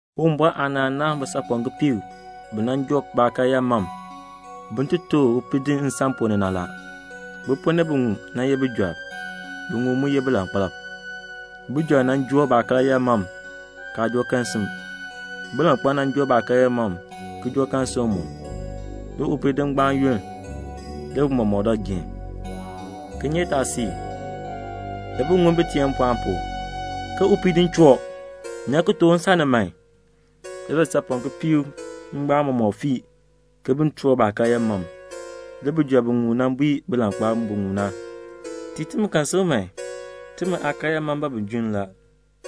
"Uwumbɔr aanaan naahn bisaapɔm kipiik bi nan joo baakaryaa mam, bin ti tooh upiidinn nsan ponn ni na. Bi ponn ni biŋmu nan ye bijɔrb, biŋmu mu nan ye bilankpalb. Bijɔrb na joo baakaryaa mam, kaa joo kerosim. Bilankpalb na joo baakaryaa mam, ki joo kerosim mu. Le upiidinn ngbaan yunn. Le bi mɔmɔk dɔ geen. "Le kinyeetaasiik le bi ŋun bi teen mpɔɔn pu, ke 'Upiidinn choo. Nyan ki tooh u nsan ni man.' Le bisaapɔm kipiik ngbaan mɔmɔk fii ke bin toor baakaryaa mam. Le bijɔrb biŋmu na bui bilankpalb biŋmu na, 'Tiin timi kerosim. Timi aakaryaa mam ban bin junn la.'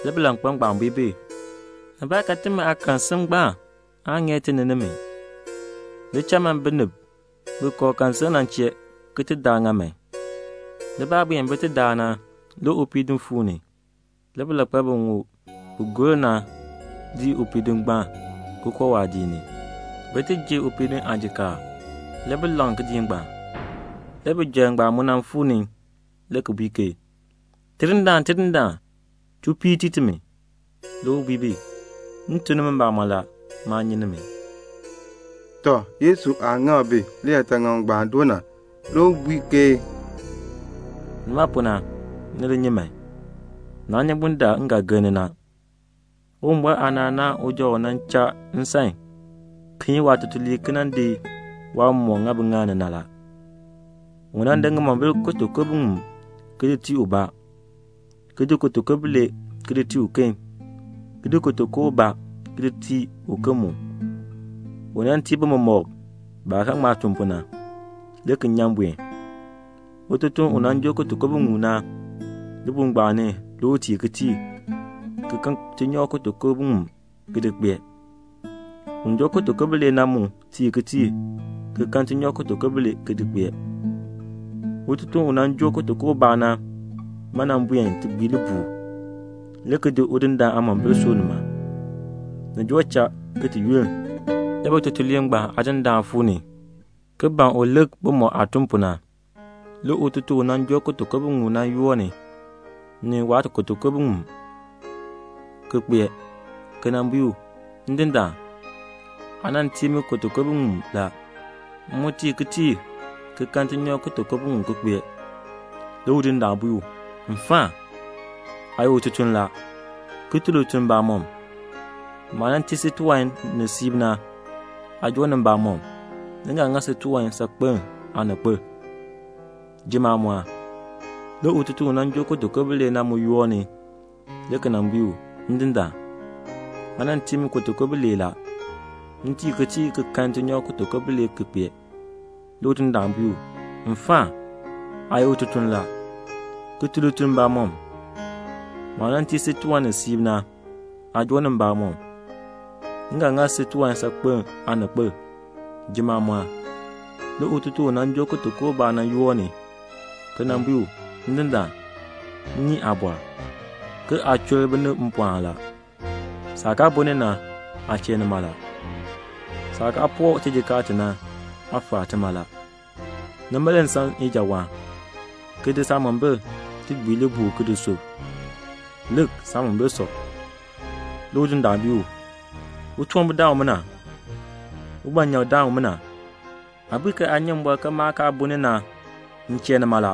Le bilankpalb ngbaan bui bi, 'Nibaakan timi aakerosim ngbaan aan ŋeer ti ni nimi. Li cha man binib bi kooh kerosim na chee ki ti daa ŋa man.' Le baah buen bi ti daa na, le upiidinn fuu ni. Le bilankpalb biŋmu bi gor na dii upiidinn ngbaan, ki koo waadiik ni, bi ti ji upiidinn aajikaar. Le bi laŋ kidiik ngbaan. "Le bijɔrb ngbaan mu nan fuu ni le ki bui ke 'Tidindaan, tidindaan, chuu piir tii timi.' Le u bui bi, 'M tuk nimi mbamɔn la, maa nyi nimi."' Tɔ, Yesu aah ŋak bi liyaataŋakl ngbaan doo na, le u bui ke, "Nima pu na, ni li nyi man! naa nyi bundaln m ga gir ni na." "Uwumbɔr aanaan naahn uja u cha nsan, ki yin waatutuliib ki nan di waawan mɔmɔk, ki di ŋa biŋaal ni. Le u di ŋimombil kutuku biŋmu ki di tii ubaa, ki di kutuku bilee ki di tii uken, ki di kutuku ubaa ki di tii uken mu. U tii bi mɔmɔk baah ga ŋma tun pu na, le ki nyan buen. Un joo kutuku biŋmu na, libuul ngbaan ni le u tiir kitiir, ki kan tinyoor kutuku biŋmu ki di kpee. Un joo kutuku bilee na mu tiir kitiir ki kan tinyoor kutuku bilee ki kpee. Un joo kutuku ubaa na buen ti gbii libuul, ki di udindaan aamombil ki di sub nima. "Ni joo cha ki yunn, le bitutuliib ngbaan aadindaan fuu ni, ki ban u nan lik bimɔk aah tun pu na. Le ututuln u nan joo kutuku biŋmu na yoor ni, ni waakutuku biŋmu ki kpee, ki nan bui u, 'Ndindaan, aa nan tii mi kutuku biŋmu la. M mu tiir kitiir ki kan tinyoor kutuku biŋmu ki kpee.' Le udindaan bui u, 'Mfaan, aa ye ututuln la, ki tun lituln mbamɔm. Maah nan tii si tiwan ni siib na, aa joo ni mbamɔm. M ga ŋa si tiwan saakpen aaninkpil. Jim maamɔɔn.' Le ututuln u nan joo kutuku bilee na mu yoor ni, le ki nan bui u, 'Ndindaan, aa nan tii mi kutuku bilee la. M tiir kitiir ki kan tinyoor kutuku bilee ki kpee.' Le udindaan bui u, 'Mfaan, aa ye ututuln la, ki tun lituln mbamɔm. Maah nan tii si tiwan ni siib na, aa joo ni mbamɔm. M ga ŋa si tiwan saakpen aaninkpil. Jim maamɔɔn.' Le ututuln u nan joo kutuku ubaa na yoor ni, ki nan bui u, 'Ndindaan, m nyi aabɔr, ke aa chur binib mpɔɔn la. Saah kaa bun ni na, aa chee nima la. Saah kaa poo tijikaar ti na, aa faa tima la. Nima le m san ijawaan, ki di saamombil, ki gbii libuul ki di sub. Lik, saamombil sɔ.' Le udindaan bui u, 'Utunwambirdaan umina, ugbanyak-daan umina, aa bui ke aa nyi mbɔr ke maah kaa bun ni na, m chee nima la,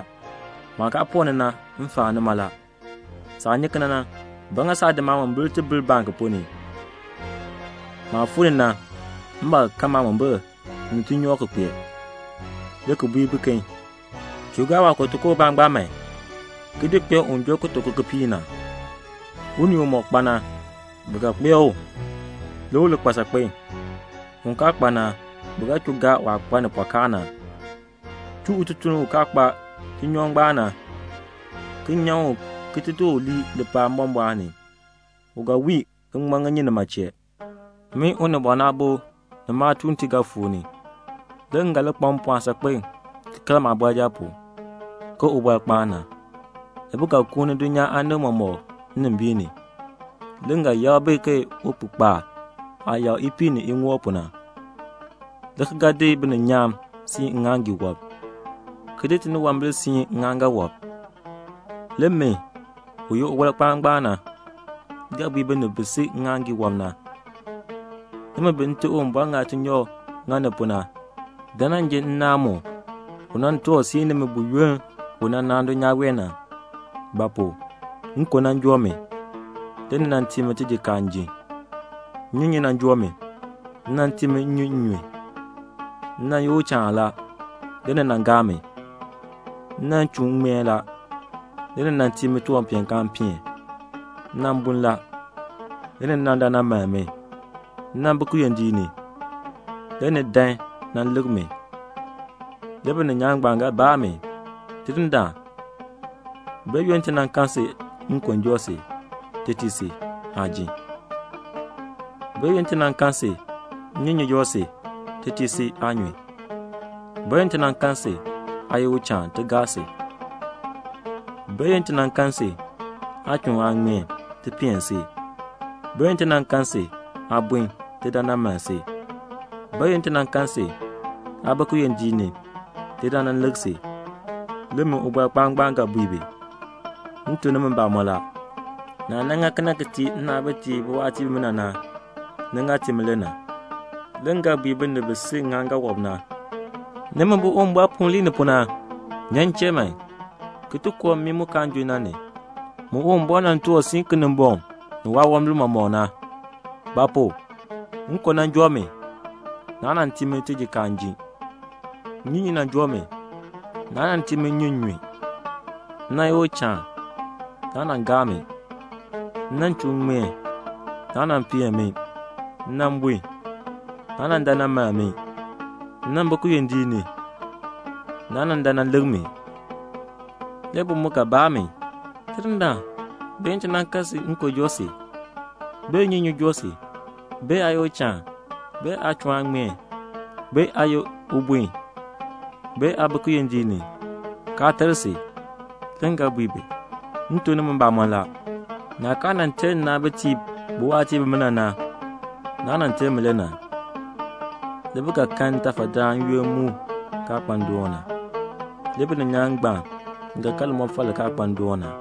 maah kaa poo ti na, m faa tima la. Saah nyi kena na, ba ŋa saa di maamombil ki ti di bil baŋk ponn ni? Maah fuu ni na, m ba ga kan maamombil ni tinyoor ki kpee,' le ki bui biken, 'Chuu gaa waakutuku ubaa ngbaan man, ki di kpee un joo kutuku kipiik na. Unii umɔk kpa na, bi ga kpee u, le u li kpa saakpen. Un kaa kpa na, bi ga chuu gaa waah kpa ni pɔkaa na. Chuu ututuln ngbaan u kaa kpa tinyoor na, ki nyan u ki di lii lipaal mbɔmbɔɔn ni. U ga wii ki ŋman ŋinyin nima chee."' "Min Unibɔn Aabo ni maatuuntiib ga fuu ni. Le m ga li kpa mpɔɔn saakpen ki kal maabɔrjal pu, ke ubɔrkpaan na. Le bi ga kuun dulnyaa aanib mɔmɔk nnimbiin ni. Le m ga yakr bi ke upihkpaal aah yakr ipiih ni iŋoob pu na, le ki ga di bininyaan ki siin ŋŋaaŋgii wɔb, ki di tiniwambir ki siin ŋŋaaŋgan wɔb. Le min, u ye Ubɔrkpaan na, ga bui binib bi si ŋŋaaŋgii wɔb na, 'Nimi bi Nte Uwumbɔr ŋa tinyoor ki ŋa ni pu na, dan nan ji nnaan mu u nan toor ki siin nimi buyoonn u nan naan dulnyaa wee na. Ba pu? nkon nan joo mi, le ni nan tii mi tijikaar m ji. Nnyunyun nan joo mi, ni nan tii mi nnyun m nyun. M nan ye uchaan la, le ni nan gaa mi. M nan chuun m ŋmeen la, le ni nan tii mi tiwanpeenkaan m peen. M nan bun la, le ni dan nan mann mi. M nan bi kiyondiik ni, le ni dan nan lik mi.' Le bininyaan ngbaan ga baa mi, 'Tidindaan, bayoonn ti nan kan si nkon joo si, ti tii si, aa ji? Bayoonn ti nan kan si, nnyunyun joo si, ti tii si, aa nyun? Bayoonn ti nan kan si, aa ye uchaan, ti gaa si? Bayoonn ti nan kan si, aa chuun aa ŋmeen, ti peen si? Bayoonn ti nan kan si, aa bun, ti dan nan mann si? Bayoonn ti nan kan si, aa bi kiyondiik ni, ti dan nan lik si?' Le min Ubɔrkpaan, ga bui bi, 'M tuk nimi mbamɔn la, naah nan ŋa kena na ki tii nnaabitiib bimina bi ye biwaatiib na, ni ŋa tii mi le na.' "Le m ga bui binib bi si ŋŋaaŋgan wɔb na, 'Nimi bi Uwumbɔr puun lii ni pu na, nyan m chee man, ki koo mmii mu kaan junn, mu Uwumbɔr nan tuur ki siin Kinimbɔŋ ni waawambir mɔmɔk na. Ba pu? nkon nan joo mi, naa nan tii mi tijikaar m ji. Nnyunyun nan joo mi, naa nan tii mi nnyun, m nyun. M nan ye uchaan, naa nan gaa mi. M nan chuun m ŋmeen, naa nan peen mi. M nan bun, naa nan dan nan mann mi. M nan bi kiyondiik ni, naa nan dan nan lik mi.' Le bi mu ga baa mi, 'Tidindaan, bayoonn ti nan kan si, nkon joo si, bee nnyunyun joo si, bee aa ye uchaan, bee aa chuun aa ŋmeen, bee aa ye ubun, bee aa bi kiyondiik ni, kaa ter si?' Le m ga bui bi, 'M tuk nimi mbamɔn la, naah kaa nan ter nnaabitiib bimina bi ye biwaatiib na, naa nan ter mi le na.' Le bi ga kan ntafadaan n-yoonn mu kaa kpa ndoon na. Le bininyaan ngbaan ga kan limɔfal li kaa kpa ndoon na."